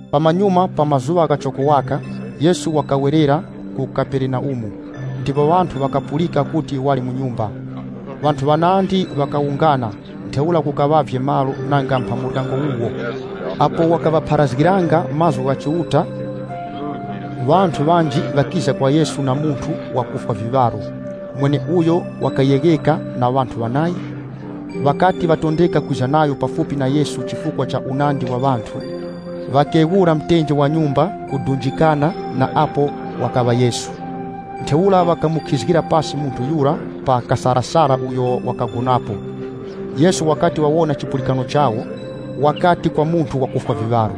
Pamanyuma pa mazuŵa ghachoko waka, Yesu wakawerera ku Kaperenaumu, ndipo ŵanthu ŵakapulika kuti wali mu nyumba. Ŵanthu ŵanandi ŵakawungana, ntheura kukaŵavye malo nanga mpha muryango wuwo. Apo wakaŵapharazgiranga mazgu gha Chiuta, ŵanthu ŵanji ŵakiza kwa Yesu na munthu wakufwa viŵaro, mweneuyo wakayegheka na ŵanthu ŵanayi. Ŵakati ŵatondeka kwiza nayo pafupi na Yesu chifukwa cha unandi wa ŵanthu, ŵakeghurapo pa mtenje wa nyumba, kudunjikana na apo wakaŵa Yesu. Ntheura ŵakamukhizgira pasi munthu yura pa kasarasara uyo wakagonapo. Yesu wakati wawona chipulikano chawo, wakati kwa munthu wakufwa viŵaro,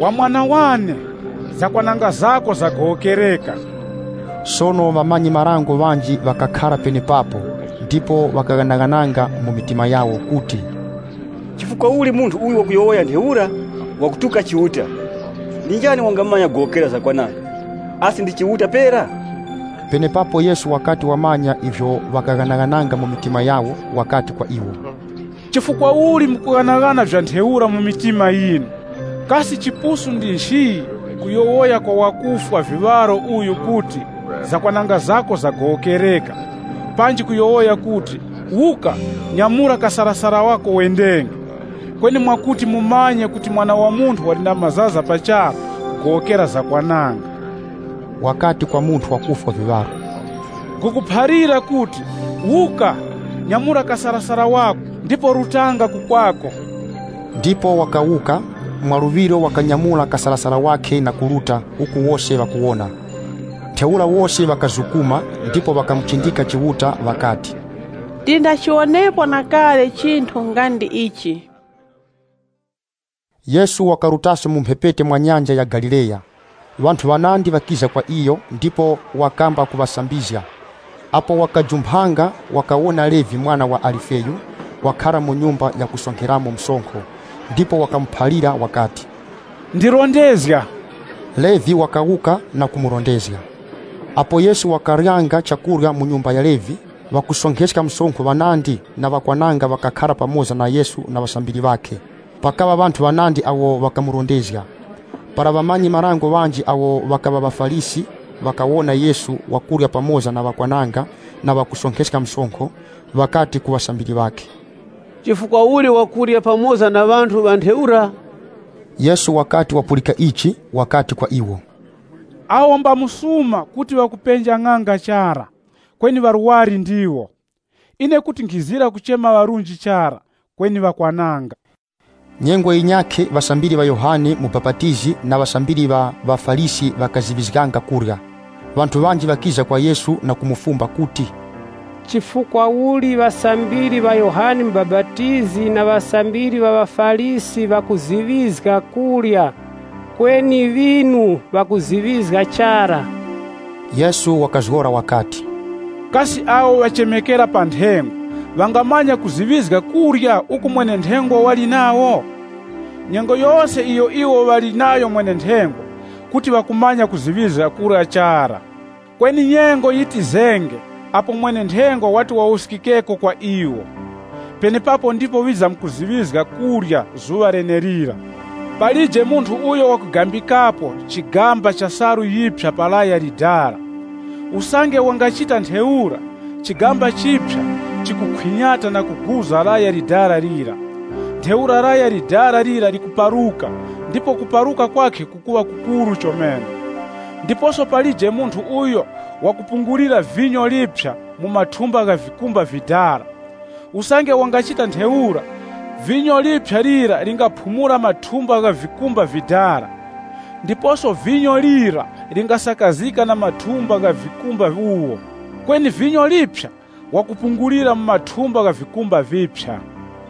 “Wa mwana wane, zakwananga zako zagowokereka.” Sono ŵamanyi-marango ŵanji ŵakakhara penepapo, ndipo ŵakaghanaghananga mu mitima yawo kuti, “Chifukwa uli munthu uyu wakuyowoya ntheura? Wakutuka Chiuta! Ndi njani wangamanya kugowokera zakwananga, asi ndi Chiuta pera?” Penepapo Yesu wakati wamanya ivyo ŵakaghanaghananga mu mitima yawo, wakati kwa iwo, “Chifukwa uli mukughanaghana vya ntheura mu mitima yinu? Kasi chipusu ndi nchi, kuyowoya kwa wakufwa viŵaro uyu kuti, ‘Zakwananga zako zagowokereka,’ panji kuyowoya kuti, ‘Wuka, nyamura kasarasara wako wendenge?’ Kweni mwakuti mumanye kuti Mwana wa Munthu wali na mazaza pa charu kugowokera zakwananga,” wakati kwa munthu wakufwa viŵaro, “Nkhukuphalira kuti, wuka, nyamura kasarasara wako ndipo rutanga ku kwako.” Ndipo wakawuka, mwaluŵiro wakanyamura kasarasara wakhe na kuruta, uku wose ŵakuwona. Ntheura wose ŵakazukuma, ndipo ŵakamuchindika Chiuta ŵakati, “Tindachiwonepo na kale chinthu nga ndi ichi.” Yesu wakarutaso mu mphepete mwa Nyanja ya Galileya. Ŵanthu ŵanandi ŵakiza kwa iyo, ndipo wakamba kuŵasambizga. Apo wakajumphanga wakawona Levi mwana wa Alifeyu, wakhara mu nyumba yakusonkheramo msonkho, ndipo wakamuphalira wakati, “Ndirondezga.” Levi wakawuka na kumurondezga. Apo Yesu wakaryanga chakurya mu nyumba ya Levi, ŵakusonkheska msonkho ŵanandi na ŵakwananga ŵakakhara pamoza na Yesu na ŵasambiri ŵakhe. Pakaŵa ŵanthu ŵanandi awo ŵakamurondezga. Para ŵamanyi-marango ŵanji awo ŵakaŵa ŵa ŵaFarisi ŵakawona Yesu wakurya pamoza na ŵakwananga na ŵakusonkheska msonkho, ŵakati ku ŵasambiri ŵakhe, “Chifukwa uli wakurya pamoza na ŵanthu ŵa ntheura?” Yesu wakati wapulika ichi, wakati kwa iwo, “Awo mba msuma kuti ŵakupenja ng'anga chara, kweni ŵarwari ndiwo. Ine kuti nkhizira kuchema ŵarunji chara, kweni ŵakwananga.” Nyengo yinyakhe ŵasambiri ŵa Yohane Mubapatizi na ŵasambiri ŵa ŵaFarisi ŵakaziŵizganga kurya. Ŵanthu ŵanji ŵakiza kwa Yesu na kumufumba kuti, “Chifukwa uli ŵasambiri ŵa Yohane Mubapatizi na ŵasambiri ŵa ŵaFarisi ŵakuziŵizga kurya, kweni ŵinu ŵakuziŵizga chara?” Yesu wakazgora wakati, “Kasi awo ŵachemekera pa nthengwa ŵangamanya kuziŵizga kurya uku mwene-nthengwa wali nawo? Nyengo yose iyo iwo ŵali nayo mwene-nthengwa, kuti ŵakumanya kuziŵizga kurya chara. Kweni nyengo yitizenge apo mwene-nthengwa wati wawuskikeko kwa iwo. Penepapo ndipo ŵizamkuziŵizga kurya zuŵa lenelira.” “Palije munthu uyo wakugambikapo chigamba cha salu yiphya pa laya likoroŵere. Usange wangachita ntheura, chigamba chiphya chikukhwinyata na kuguza laya likoroŵere lira. Ntheura laya likoroŵere lira likuparuka ndipo kuparuka kwakhe kukuŵa kukuru chomene. Ndiposo palije munthu uyo wakupungulira vinyo liphya mu mathumba gha vikumba vidala. Usange wangachita ntheura, vinyo liphya lira lingaphumula mathumba ghavikumba vidala, ndiposo vinyo lira lingasakazika na mathumba gha vikumba wuwo. Kweni vinyo liphya wakupungulira mu mathumba gha vikumba viphya.”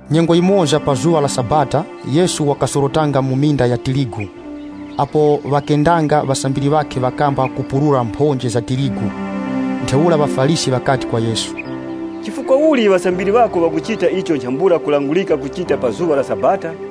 Nyengo yimoza pa zuŵa la Sabata Yesu wakasorotanga mu minda ya tirigu. Apo ŵakendanga, ŵasambiri ŵakhe ŵakamba kupurura mphonje za tirigu. Ntheura ŵaFarisi ŵakati kwa Yesu, “Chifukwa uli ŵasambiri ŵako ŵakuchita icho nchambula kulangurika kuchita pa zuŵa la Sabata?”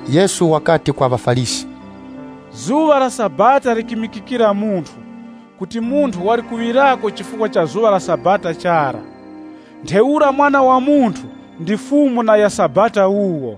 Yesu wakati kwa ŵaFarisi, “Zuŵa la Sabata, likimikikira munthu, kuti munthu wali kuŵirako chifukwa cha zuŵa la Sabata chara. Ntheura Mwana wa Munthu ndi Fumu ya Sabata.”